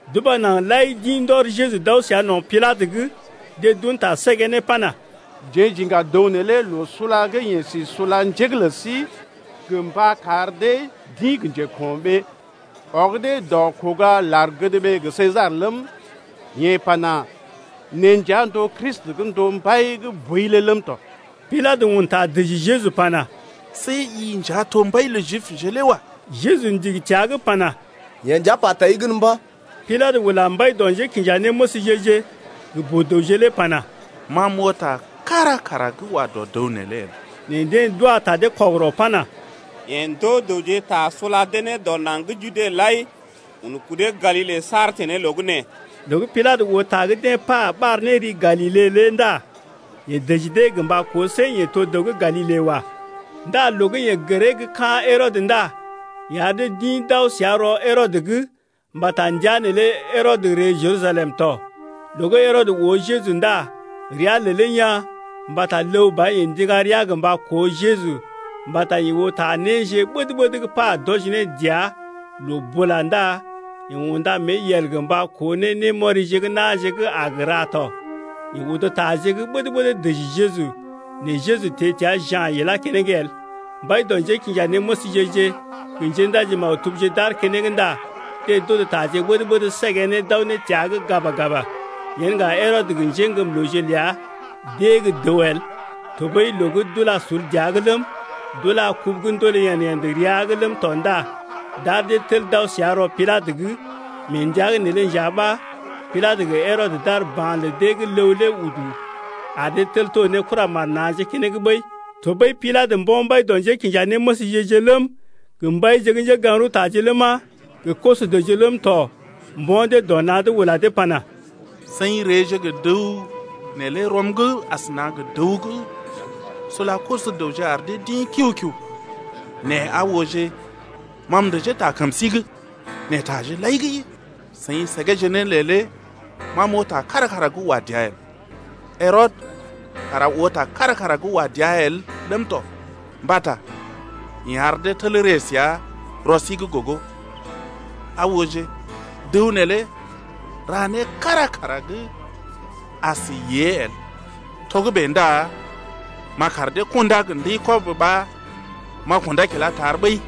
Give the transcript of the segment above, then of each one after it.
D’uba naŋg lai d’ḭ ndɔr Jeju d’aw səa no̰ Pilatə’g. Deḛ d’un ta səgee ne pana: Jeḛ j’iŋga dəw neelé loo sula gə́ yeḛ si sula njé’g lə sí gə mba kar dee d’ḭ gə njeko̰ɓee, ɔg dee dɔ kuga lar-gədɓee gə Sesar ləm, yeḛ pana: Neḛ nja n’to Kristi gə́ n’to mbai gə́ boi lé ləm tɔ. Pilatə un ta dəji Jeju pana: See i nja to mbai lə Jibje lé wa. Jeju ndigi təa’g pana: Yee nja pa tai gən mba̰. Pilatə ula mbai dɔ njékinjanéməsje-je gə boo-dəwje lé pana: Ma m’oo ta kára kara gə́ wa dɔ dəw neelé el. Nɛ deḛ d’wa ta dee kɔgərɔ pana: Yeḛ ndoo dəwje ta sula dee ne dɔ naŋg gə́ Jude lai, un kudee Galile saar teḛ ne loo gə́ nee’g. Loo gə́ Pilatə oo ta gə́ deḛ pa ɓar ne ri Galile lé ndá yeḛ dəji dee gə mba koo see yeḛ to dəw gə́ Galile wa. Ndá loo gə́ yeḛ gəree gə́ ka̰ Herɔdə ndá yeḛ ar dee d’ḭ d’aw səa rɔ Herɔdə’g mbata ndəa neelé Herɔdə ree Jerusalem tɔ. Loo gə́ Herɔdə oo Jeju ndá rəa lelee yaa̰, mbata ləw ba yeḛ ndiŋga rəa gə mba koo Jeju mbata yeḛ oo ta néje ɓəd-ɓəd gə́ pa d’wɔji ne dəa loo bula ndá yeḛ unda mée yel gə mba koo ne némɔrije gə́ na̰je gə́ a gə ra tɔ. Yeḛ odo taje gə́ ɓəd-ɓəd dəji Jeju nɛ Jeju teḛ təa ja̰ ilá keneŋ el. Mbai dɔ njékinjanéməsje-je gə njéndaji-maktubje d’aar keneŋ ndá deḛ d’odo taje ɓəd-ɓəd səgee ne d’aw ne təa’g gaba-gaba. Yen ŋga Herɔdə gə njéŋgəmlooje ləa d’ée gə́ dəw el, tɔɓəi loo gə́ d’ula sul dəa’g ləm, d’ula kubu gə́ ndoolé yḛd-yḛd rəa’g ləm tɔ ndá d’ar dee tel d’aw səa rɔ Pilatə’g. Mee ndəa’g neelé nja ɓa Pilatə gə Herɔdə d’ar ba̰ ta lə deḛ gə́ ləw lé udu ar dee tel to ne kuramar na̰je keneŋ ɓəi. Tɔɓəi Pilatə mbo̰ mbai dɔ njékinjanéməsje-je ləm, gə mbaije gə́ njégaŋ-rəwtaje ləma, gə koso-dəwje ləm tɔ mbo̰ dee dɔ na̰’d ula dee pana: Seḭ reeje gə dəw neelé rɔm’g asəna gə dəw gə́ sula koso-dəwje ar dee d’ḭ kiu-kiu. Nɛ aa ooje ma m’dəjee ta kəm sí’g, nɛ taje lai gə́ seḭ səgeeje ne lé ma m’oo ta kára kara gə́ wa dəa el. Herɔdə kara oo ta kára kara gə́ wa dəa el ləm tɔ, mbata yeḛ ar dee tel ree səa rɔ sí’g gogo, aa ooje, dəw neelé ra né kára kara gə́ as yée el. Togə́bè ndá m’a kar dee kundá gə ndəi-kɔb ɓa m’a kundá kilá tar ɓəi.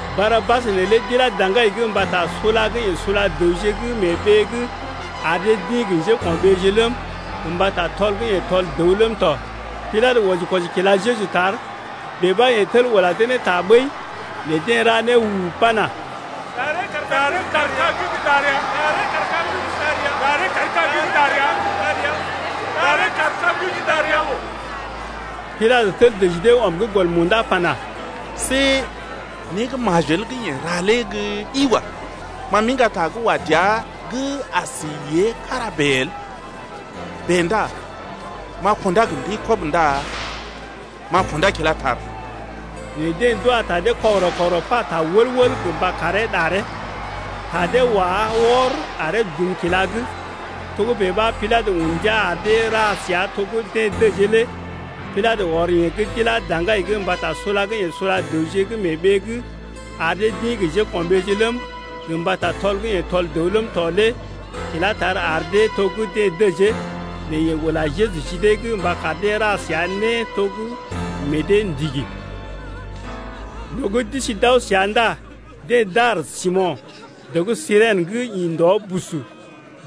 Barabas neelé d’ilá daŋgai’g mbata sula gə́ yeḛ sula dəwje gə́ mee ɓee’g ar dee d’ḭ gə njéko̰ɓeeje ləm, gə mbata tɔl gə́ yeḛ tɔl dəw ləm tɔ. Pilatə wɔji-kwɔji kila Jeju tar, bèe ɓa yeḛ tel ula dee ne ta ɓəi. Nɛ deḛ ra né u-u-u pana: Ɗaree kaar kag’d gə́ ɗar ya, ɗaree kaar kag’d gə́ ɗar ya. Pilatə tel dəji dee ɔm gə́ gɔl munda pana: See né gə́ majel gə́ yeḛ ra lé gə́ ɗi wa. Ma m’iŋga ta gə́ wa dəa gə́ as yée kára bèe el. Bèe ndá m’a kundá gə ndəi-kɔb ndá m’a kundá kilá tar. Nɛ deḛ d’wa ta dee kɔgərɔ-kɔgərɔ pata wəl-wəl gə mba karee ɗaree. Ta dee wá wɔr aree dum kila’g. Togə́bè ɓa Pilatə un ndia ar dee ra səa to gə́ deḛ dəjee lé ya. Pilatə ɔr yeḛ gə́ d’ilá daŋgai’g mbata sula gə́ yeḛ sula dəwje gə́ mee ɓee’g ar dee d’ḭ gə njéko̰ɓeeje ləm, gə mbata tɔl gə́ yeḛ tɔl dəw ləm tɔ lé ilá tar ar dee to gə́ deḛ dəjee, nɛ yeḛ ula Jeju ji dee’g mba kar dee ra səa né to gə́ meḛ dee ndigi. Loo gə́ d’isi d’aw səa ndá deḛ dar Simo̰, dəw gə́ Sirèn bus, gə́ ḭ ndɔ, deḛ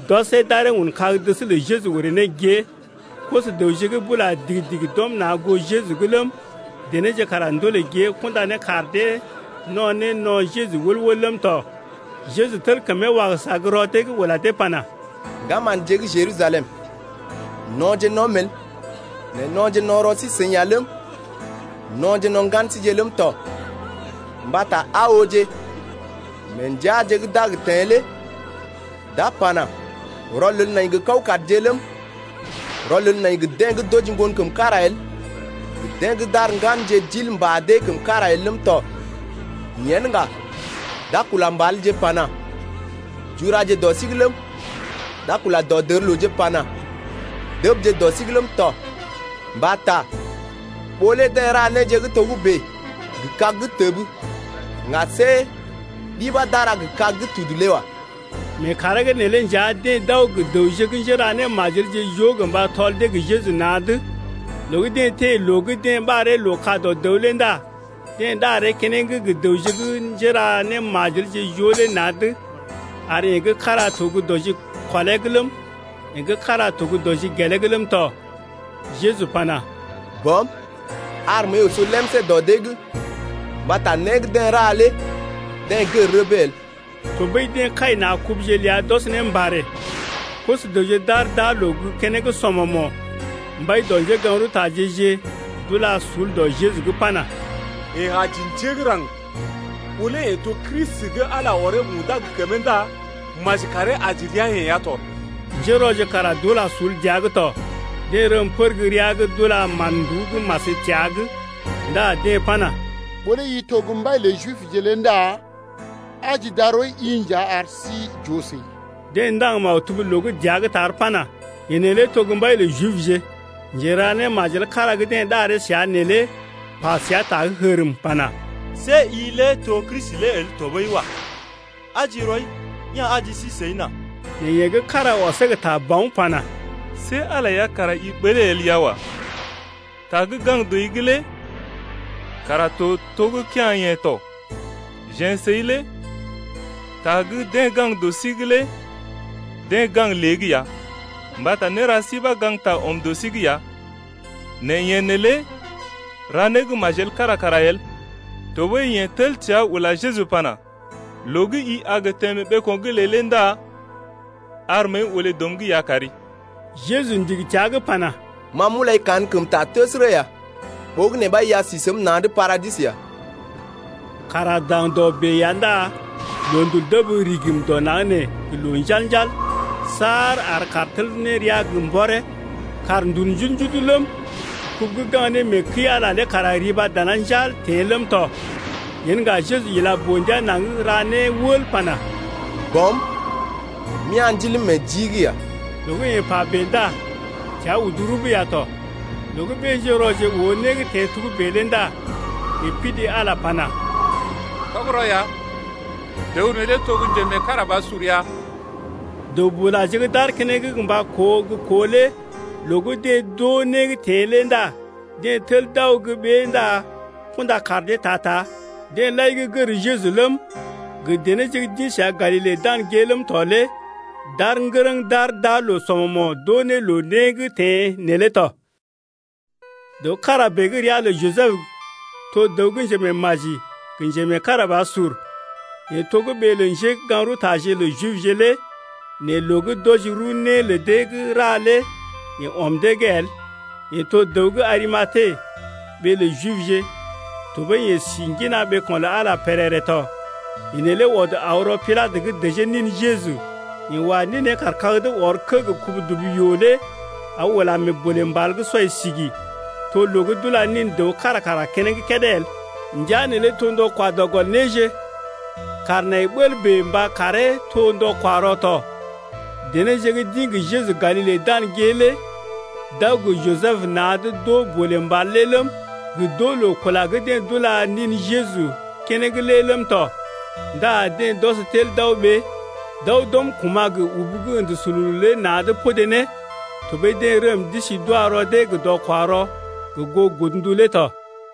d’ɔsee d’aree un kag-dəs lə Jeju orè ne gée. Koso-dəwje gə́ bula digi-digi d’ɔm na̰ goo Jeju’g ləm, denéje kara ndolè gée kunda ne kaar dee no̰ ne no̰ Jeju wəl-wəl ləm tɔ. Jeju tel kəmee wagəsa gə́ rɔ dee’g ula dee pana: Ŋgama̰dje gə́ dené gə́ Jerusalem, no̰je no̰’m el, nɛ no̰je no̰ rɔ sí-seḭ ya ləm, no̰je no̰ ŋgan síje ləm tɔ. Mbata aa ooje, mee ndəaje d’a gə teḛ lé d’a pana: Rɔlel nai gə kawkadje ləm, rɔlel nai gə́ deḛ gə́ d’oji ŋgon kəm kára el gə deḛ gə́ d’ar ŋganje d’il mbà dee kəm kára el ləm tɔ. Yen ŋga d’a kula mbalje pana: Juraje dɔ sí’g ləm, d’a kula dɔdərlooje pana: Dəbje dɔ sí’g ləm tɔ! Mbata ɓó lé deḛ ra néje gə́ togə́bè gə kag gə́ təb ŋga see ɗi ɓa d’a ra gə kag gə́ tudu lé wa. Mee kàree’g neelé nja deḛ d’aw gə dəwje gə́ njéra némajelje joo gə mba tɔl dee gə Jeju na̰’d. Loo gə́ deḛ teḛ loo gə́ deḛ ɓaree Loo-ka-dɔ-dəw lé ndá deḛ ɗaree keneŋ gə dəwje gə́ njéra némajelje joo lé na̰’d ar yeḛ gə́ kára to gə́ dɔ jikɔlee’g ləm, yeḛ gə́ kára to gə dɔ jigelee’g ləm tɔ. Jeju pana: Bɔm, ar məəi oso lemsé dɔ dee’g mbata né gə́ deḛ ra lé deḛ gər rəbee el. Tɔɓəi deḛ kai na̰ kubuje ləa d’ɔs ne mbarè. Koso-dəwje d’aar d’aa loo gə́ keneŋ sɔmɔmo̰. Mbai dɔ njégaŋ-rəwtaje-je d’ula sul dɔ Jeju’g pana: Yeḛ aji njé gə́ raŋg, ɓó lé yeḛ to Kristi gə́ Ala ɔree undá gə kəmee ndá maji karee aji rəa-yeḛ ya tɔ. Njérɔje kara d’ula sul dəa’g tɔ, deḛ rəm pər gə́ rəa’g d’ula mán-nduú gə́ mas təa’g 7ndá deḛ pana: Ɓó lé i to gə́ mbai lə Jibje lé ndá aji darɔi-i nja ar sí j’oo səi. Deḛ ndaŋg maktub loo gə́ dəa’g tar pana: Yeḛ neelé to gə́ mbai lə Jibje. Njera némajel kára gə́ deḛ ɗaree səa neelé pa səa ta gə́ hərm pana: See i lé to gə́ Kristi lé el tɔɓəi wa. Aji rɔi ya̰ aji sí səi nà. Nɛ yeḛ gə́ kára ɔsee gə ta bawn pana: See Ala lé ya kara i ɓəlee el ya wa. Ta gə́ gaŋg dɔi’g lé kara to to gə́ kea̰-yeḛ tɔ. Jeḛ səi lé ta gə́ deḛ gaŋg dɔ sí’g lé deḛ gaŋg lée’g ya mbata néra sí ɓa gaŋgta ɔm dɔ sí’g ya, nɛ yeḛ neelé ra né gə́ majel kára kara el. Tɔɓəi yeḛ tel təa ula Jeju pana: Loo gə́ i a gə teḛ mee ɓeeko̰’g ləi ndá ar məəi olé dɔm’g ya kari. Jeju ndigi təa’g pana: Ma m’ulai kankəmta təsərə ya, ɓogənè ɓa i a si səm na̰’d paradis ya. Kàr aar daŋdɔ bèe ya ndá loondul dəb rigim dɔ naŋg nee gə loo njal-njal saar ar kàr tel ne rəa gə mbɔree. Kàr ndul njudu-njudu ləm, kubu gə́ gaŋg ne mee kəi-Ala lé kara riba dana njal teḛ ləm tɔ. Yen ŋga Jeju ila boo-ndia naŋg ra né wəl pana: Bɔm, m’ya̰ ndiləm meḛ jii’g ya. Loo gə́ yeḛ pa bèe ndá təa udu rub ya tɔ. Loo gə́ ɓé-njérɔje oo né gə́ teḛ togə́bè lé ndá yeḛ pidi Ala pana: Tɔgərɔ ya, dəw neelé to gə́ njemeekarabasur ya. Dəw-bulaje gə́ d’aar keneŋ mba koo gə́ koo lé loo gə́ deḛ d’oo né gə́ teḛ lé ndá deḛ tel d’aw gə́ ɓée ndá kunda kaar dee ta-ta. Deḛ lai gə́ gər Jeju ləm, gə denéje gə́ d’ḭ səa Galile dan gée ləm tɔ lé d’aar ŋgərəŋ d’aar d’aa loo sɔmɔmo̰ d’oo ne loo né gə́ teḛ neelé tɔ. Dəw kára bèe gə́ ria lə Jisəb to dəw gə́ njemeemaji gə njemeekarabasur, yeḛ to gə́ ɓee lə njégaŋ-rəwtaje lə Jibje lé nɛ loo gə́ d’wɔji rəw né lə dee gə́ ra lé yeḛ ɔm dee’g el, yeḛ to dəw gə́ Arimate ɓee lə Jibje tɔɓəi yeḛ si ŋgina ɓeeko̰ lə Ala lé pèrèrè tɔ. Yeḛ neelé ɔd aw rɔ Pilatə’g dəjee nin Jeju. Yeḛ wa ninee kaar kag’d ɔr kə́ gə kubu-dubu-yoo lé aw ulá mee bolè mbal gə́ sɔi sigi’g, to loo gə́ d’ula nin dəw kára kara keneŋ kédé el. Ndəa neelé to ndɔ kwa dɔ gɔl néje, kàr nai bəl bèe mba karee to ndɔ-kwa-rɔ tɔ. Denéje gə́ d’ḭ gə Jeju Galile dan gée lé d’aw gə Jisəb na̰’d d’oo bolè mbal lé ləm, gə d’oo loo kula gə́ deḛ d’ula nin Jeju keneŋ lé ləm tɔ ndá deḛ d’ɔs tel d’aw ɓée, d’aw d’uru kuma̰ gə ubu gə́ ə̰də sululu lé na̰’d podé ne. Tɔɓəi deḛ rəm d’isi d’wa rɔ dee gə ndɔ-kwa-rɔ gə goo godndu lé tɔ.